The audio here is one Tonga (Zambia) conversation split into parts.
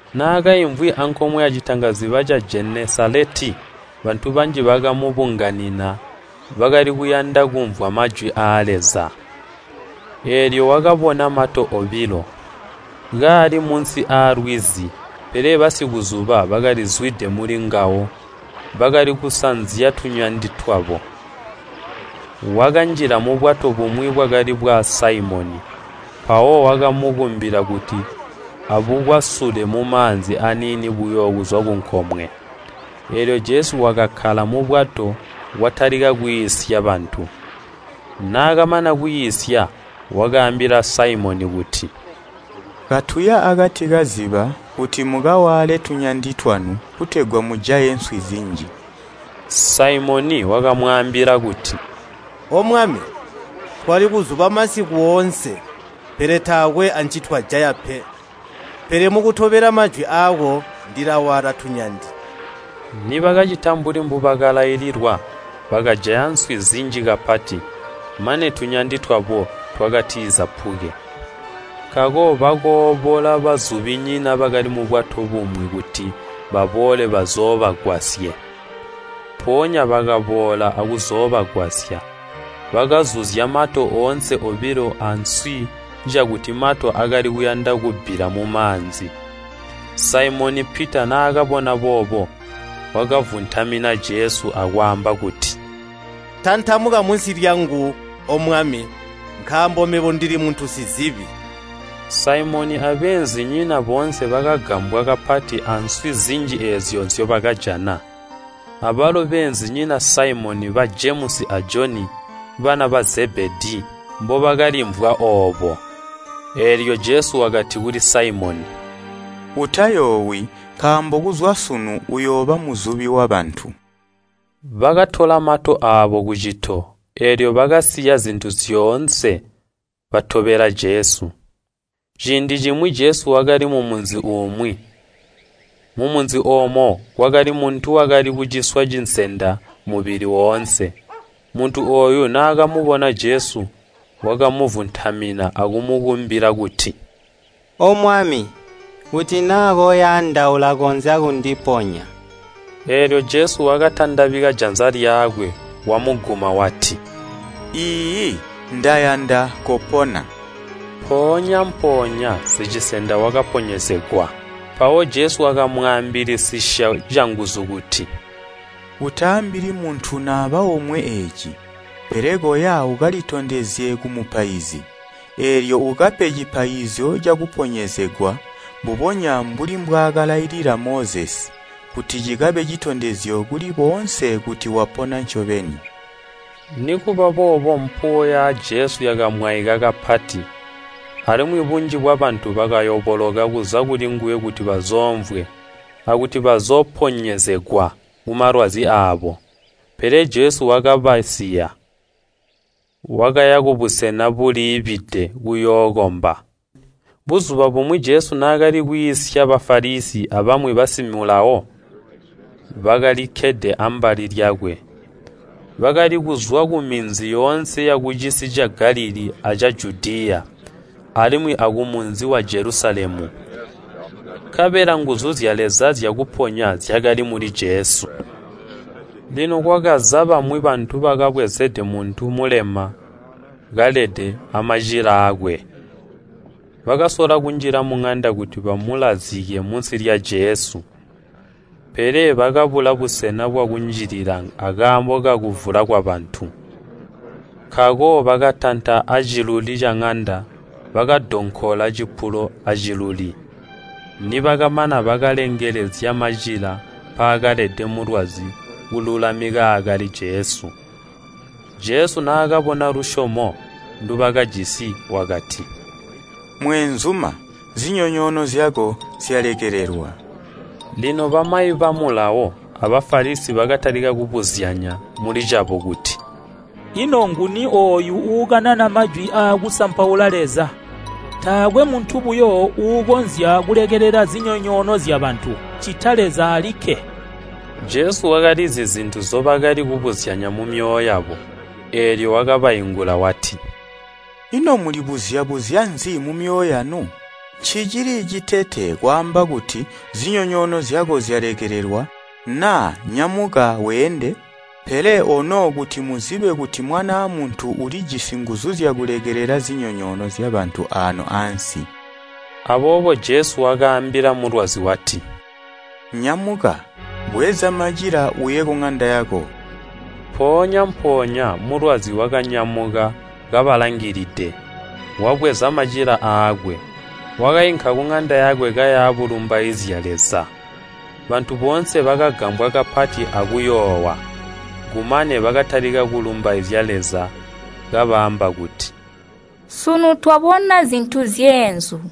Naakaimvwi ankomwe yalwizi lwa Jenesaleti bantu banji bakamubunganina bakali kuyanda kumvwa majwi aa Leza. Eelyo wakabona mato obilo, kaali munsi alwizi pele basikuzuba bakalizwide mulingawo, bakali kusanzya tunyandi twabo. Wakanjila mubwato bumwi bwakali bwa Saimoni, mpawo wakamukumbila kuti abukwasule mumaanzi aniini buyo kuzwa kunkomwe, eelyo Jesu wakakkala mubwato watalika kwiisya bantu. Naakamana kwiisya wakaambila Saimoni kuti, “Katuya akati kaziba kuti mukawaale tunyandi twanu kutegwa mujaye nswi zinji.” Saimoni wakamwaambila kuti, “O Mwami, twali kuzuba masiku oonse, pele taakwe ancitwajaya pe, pele mukutobela majwi aako ndilawaala tunyandi.” Nibakacita mbuli mbubakalaililwa, bakajaya nswi zinji kapati, mane tunyandi twabo twakatizapuke. Nkaako bakoobola bazubinyina bakali mubwato bumwi kuti baboole bazoobagwasye. Mpoonya bakaboola akuzoobagwasya. Bakazuzya mato oonse obilo answi cakuti mato akali kuyanda kubbila mumaanzi. Saimoni Pita naakabona boobo, wakavuntamina Jesu, akwaamba kuti, “Tantamuka munsi lyangu, O Mwami, nkaambo mebo ndili muntu sizibi!” Saimoni abeenzinyina boonse bakagambwa kapati answi zinji eezyo nzyobakajana, abalo beenzinyina Saimoni, ba Jemusi a Joni, bana ba Zebedii, mbobakalimvwa oobo. Eelyo Jesu wakati kuli Saimoni, “Utayoowi, nkaambo kuzwa sunu uyooba muzubi wabantu.” Bakatola mato aabo kucito, eelyo bakasiya zintu zyoonse batobela Jesu. Ciindi cimwi Jesu wakali mumunzi umwi. Mumunzi oomo kwakali muntu wakali kuciswa cinsenda mubili woonse. Muntu ooyu naakamubona Jesu, wakamuvuntamina akumukumbila kuti, “O Mwami, kuti naa koyanda ulakonzya kundiponya.” Eelyo Jesu wakatandabika janza lyakwe wamuguma wati, “Iiyi, ndayanda, kopona.” Mpoonya-mpoonya sicinsenda wakaponyezegwa. Mpawo Jesu wakamwaambilisisya canguzu kuti, “Utaambili muntu naba omwe eeci, pele koya ukalitondezye kumupaizi, eelyo ukape cipaizyo cakuponyezegwa, mbubonya mbuli mbwaakalailila Mozesi, kuti cikabe citondezyo kuli boonse kuti wapona ncobeni.” Nikubaboobo mpuwo ya Jesu yakamwaika kapati, alimwi bunji bwabantu bakayoboloka kuza kulinguwe kuti bazoomvwe, akuti bazooponyezegwa kumalwazi aabo. Pele Jesu wakabasiya, wakaya kubusena buliibide kuyookomba. Buzuba bumwi Jesu naakali kwiisya Bafalisi, abamwi bamayi ba Mulawo, bakalikkede ambali lyakwe, bakali kuzwa kuminzi yoonse yakucisi ca Galilii aca Judiya, alimwi akumunzi wa Jelusalemu. Nkabela nguzu zya Leza zyakuponya zyakali muli Jesu. Lino kwakaza bamwi bantu bakabwezede muntu mulema kalede amacila aakwe. Bakasola kunjila muŋanda kuti bamulazike munsi lya Jesu. Pele bakabula busena bwakunjilila akaambo kakuvula kwabantu. Nkaako bakatanta aciluli caŋanda, bakadonkola cipulo aciluli. Nibakamana, bakalengelezya macila mpaakalede mulwazi kululamika aakali Jesu. Jesu naakabona lusyomo ndubakajisi wakati, “Mweenzuma, zinyonyoono zyako zyalekelelwa.” Lino bamayi ba Mulawo a Bafalisi bakatalika kubuzyanya mulicabo kuti, “Ino nguni ooyu uukanana majwi aakusampaula Leza? Taakwe muntu buyo uukonzya kulekelela zinyonyoono zyabantu, ccita Leza alikke.” Jesu wakalizi zintu nzyibakali kubuzyanya mumyoyo yabo, eelyo wakabaingula wati, “Ino mulibuzya-buzya nzi mumyoyo yanu? Ncicili citete kwaamba kuti, ‘Zinyonyoono zyako zyalekelelwa,’ naa ‘Nyamuka, weende?’ Pele ono kuti muzibe kuti Mwanaa Muntu ulijisi nguzu zyakulekelela zinyonyoono zyabantu aano ansi.” Aboobo Jesu wakaambila mulwazi wati, “Nyamuka, bweza macila, uye kuŋanda yako.” Mpoonya-mpoonya mulwazi wakanyamuka kabalangilide, wabweza macila aakwe, wakainka kuŋanda yakwe kaya bulumbaizya Leza. Bantu boonse bakagambwa kapati akuyoowa, Kumane bakatalika kulumbaizya Leza kabaamba kuti, “Sunu twabona zintu zyeenzu!”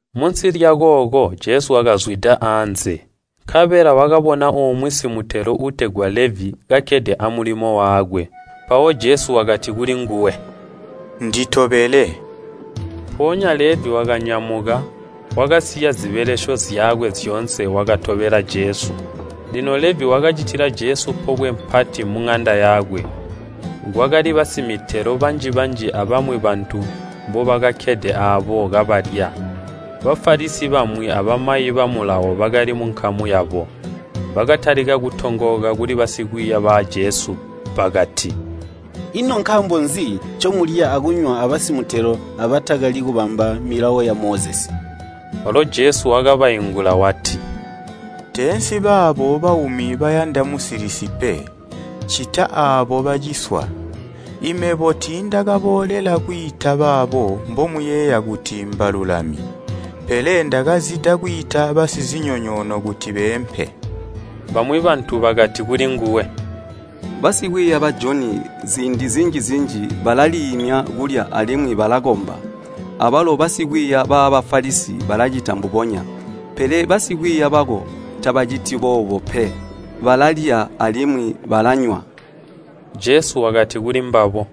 Munsi lyakooko Jesu wakazwida anze. Nkabela wakabona umwi simutelo uutegwa Levi kakkede amulimo wakwe. Mpawo Jesu wakati kulinguwe, “Nditobele.” Mpoonya Levi wakanyamuka, wakasiya zibelesyo zyakwe zyoonse wakatobela Jesu. Lino Levi wakacitila Jesu pobwe pati muŋanda yakwe. Kwakali basimitelo banji-banji abamwi bantu mbobakakkede aabo kabalya. Bafalisi bamwi abamayi ba Mulawo bakali munkamu yabo, bakatalika kutongooka kuli basikwiiya ba Jesu bakati, “Ino nkaambo nzi ncomulya akunywa abasimutelo abatakali kubamba milawo ya Mozesi?” Walo Jesu wakabaingula wati, “Teensi baabo baumi bayanda musilisi pe, ccita aabo baciswa. Imebo tiindakaboolela kwiita baabo mbomuyeeya kuti mbalulami, pele ndakazida kwiita basizinyonyoono kuti beempe.” Bamwi bantu bakati kulinguwe, “Basikwiiya ba Joni ziindi zinji-zinji balaliimya kulya alimwi balakomba, abalo basikwiiya ba Bafalisi balacita mbubonya, pele basikwiiya bako tabaciti boobo pe, balalya alimwi balanywa.” Jesu wakati kulimbabo,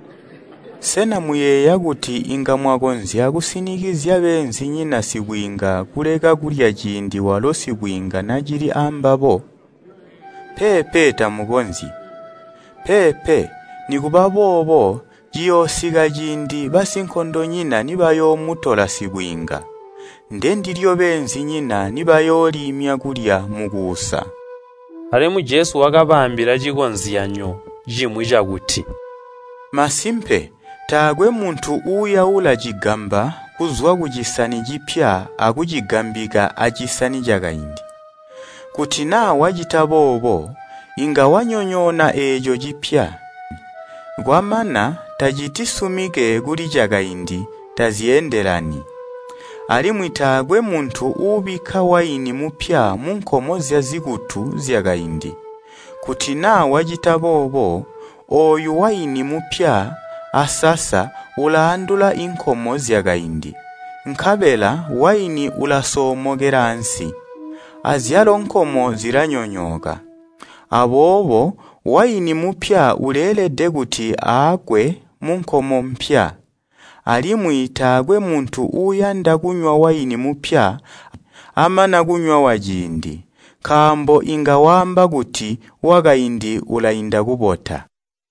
“Sena muyeeya kuti inga mwakonzya kusinikizya beenzinyina sibwiinga kuleka kulya ciindi walo sibwiinga nacili ambabo? Peepe tamukonzyi! Peepe, nikuba boobo ciyoosika ciindi basinkondonyina nibayoomutola sibwiinga, ndendilyo beenzinyina nibayooliimya kulya mukuusa.” Alimwi Jesu wakabaambila cikozyanyo cimwi cakuti, “Masimpe taakwe muntu uuyaula cigamba kuzwa kucisani cipya akucigambika acisani cakaindi. Kuti naa wacita boobo, inga wanyonyoona eeco cipya, kwamana tacitisumike kuli cakaindi, tazyeendelani. Alimwi taakwe muntu uubika waini mupya munkomo zyazikutu zyakaindi. Kuti naa wacita boobo, ooyu waini mupya asasa ulaandula inkomo zyakaindi, nkabela waini ulasoomokela ansi, azyalo nkomo zilanyonyooka. Aboobo waini mupya uleelede kuti aakwe munkomo mpya. Alimwi taakwe muntu uuyanda kunywa waini mupya amana kunywa waciindi, nkaambo inga waamba kuti, wakaindi ulainda kubota.”